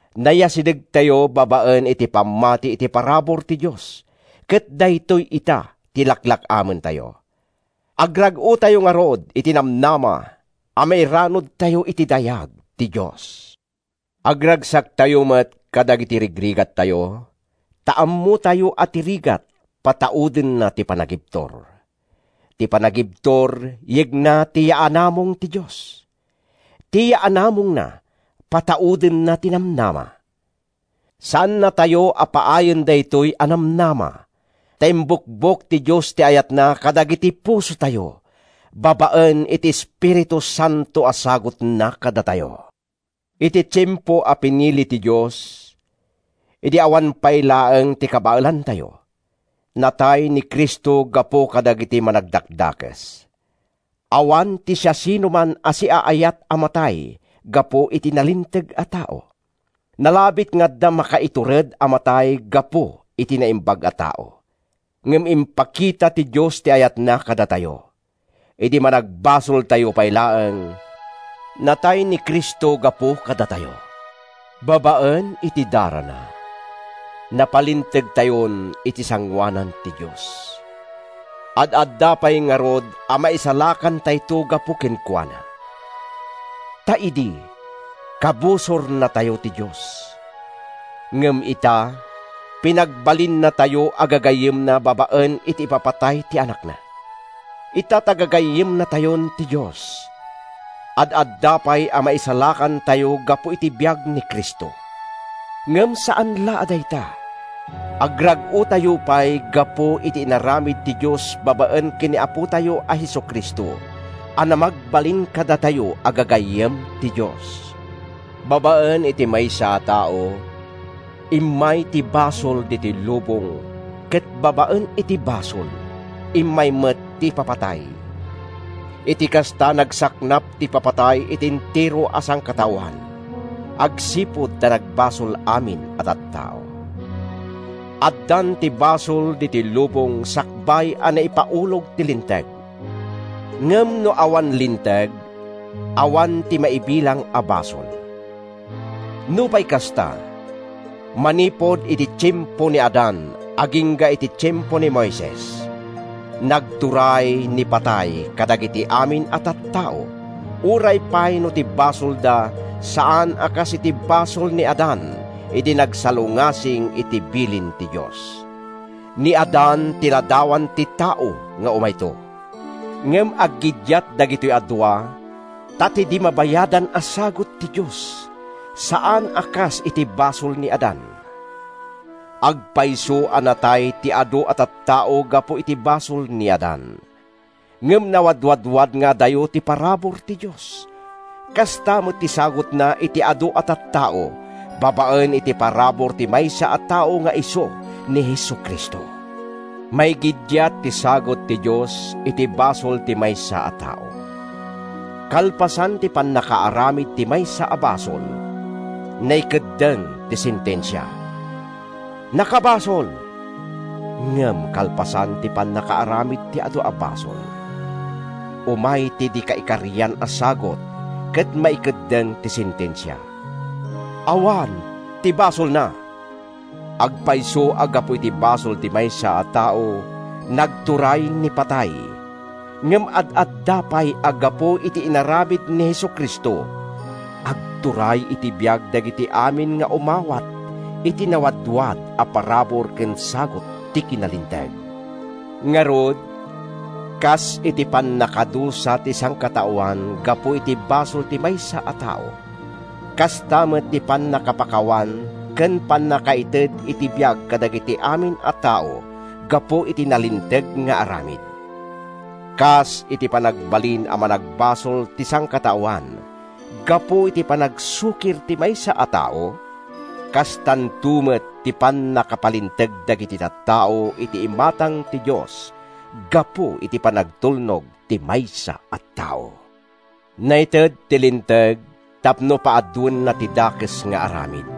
Nayasidegtayo babaen iti pammati iti parabur ti Dios ket daytoy ita ti laklak-amentayo. Agrag-otayo ngarud iti namnama a mairanudtayo iti dayag ti Dios! Agragsaktayo met kadagiti rigrigattayo, ta ammotayo a ti rigat pataudenna ti panagibtur. Ti panagibtur yegna ti yaanamong ti Dios. Ti yaanamongna pataudenna ti namnama. Saannatayo a paayen daytoy a namnama ta imbukbok ti Dios ti ayatna kadagiti pusotayo babaen iti Espiritu Santo a sagutna kadatayo. Iti tiempo a pinili ti Dios, idi awan pay laeng ti kabaelantayo, natay ni Cristo gapu kadagiti managdakdakes. Awan ti siasinoman a siaayat a matay gapu iti nalinteg a tao. Nalabit nga adda makaitured a matay gapu iti naimbag a tao. Ngem impakita ti Dios ti ayatna kadatayo: Idi managbasoltayo pay laeng, natay ni Cristo gapu kadatayo! Babaen iti darana, napalintegtayon iti sangoanan ti Dios. Ad-adda pay ngarud a maisalakantayto gapu kenkuana. Ta idi, kabusornatayo ti Dios. Ngem ita, pinagbalinnatayo a gagayyemna babaen iti ipapatay ti Anakna. Ita ta gagayyemnatayon ti Dios, ad-adda pay a maisalakantayo gapu iti biag ni Cristo! Ngem saan la a dayta, agrag-otayo pay gapu iti inaramid ti Dios babaen ken ni Apotayo a Jesu-Cristo a namagbalin kadatayo a gagayyem ti Dios. Babaen iti maysa a tao, immay ti basol ditoy lubong ket babaen iti basol, immay met ti ipapatay. Iti kasta, nagsaknap ti ipapatay iti entero a sangkataoan, agsipud ta nagbasol amin a tattao. Addan ti basol ditoy lubong sakbay a naipaulog ti Linteg. Ngem no awan linteg, awan ti maibilang a basol. Nupay kasta, manipud idi tiempo ni Adan agingga iti tiempo ni Moises, nagturay ni patay kadagiti amin a tattao, uray pay no ti basolda saan a kas iti basol ni Adan idi nagsalungasing iti bilin ti Dios. Ni Adan ti ladawan ti tao nga umayto. Ngem aggiddiat dagitoy a dua, ta ti di mabayadan a sagut ti Dios, saan a kas iti basol ni Adan. Agpayso a natay ti adu a tattao gapu iti basol ni Adan. Ngem nawadwadwad nga adayo ti parabur ti Dios, kasta met ti sagutna iti adu a tattao babaen iti parabur ti maysa a tao nga isu ni Jesu-Cristo. Maigiddiat ti sagut ti Dios iti basol ti maysa a tao. Kalpasan ti pannakaaramid ti maysa a basol, naikeddeng ti sentensia: “Nakabasol.” Ngem kalpasan ti pannakaaramid ti adu a basol, umay ti di kaikarian a sagut ket maikeddeng ti sentensia: “Awan ti basolna!” Agpayso a gapu iti basol ti maysa a tao, nagturay ni patay, ngem ad-adda pay a gapu iti inaramid ni Jesu-Cristo, agturay iti biag dagiti amin nga umawat iti nawadwad a parabur ken sagut ti kinalinteg. Ngarud, kas iti pannakadusa ti sangkataoan gapu iti basol ti maysa a tao, kasta met ti pannakapakawan ken pannakaited ti biag kadagiti amin a tao gapu iti nalinteg nga aramid. Kas ti panagbalin a managbasol ti sangkataoan gapu iti panagsukir ti maysa a tao, kastanto met ti pannakapalinteg dagiti tattao iti imatang ti Dios gapu iti panagtulnog ti maysa a tao. Naited ti Linteg tapno paaduenna ti dakes nga aramid.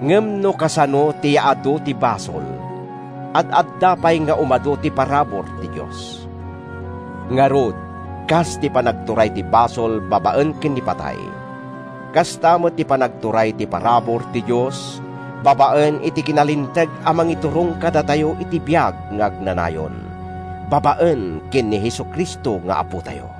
Ngem no kasano ti yaadu ti basol, ad-adda pay nga umadu ti parabur ti Dios. Ngarud, kas ti panagturay ti basol babaen ken ni patay, kasta met ti panagturay ti parabur ti Dios babaen iti kinalinteg a mangiturong kadatayo iti biag nga agnanayon babaen ken ni Jesu-Cristo nga Apotayo.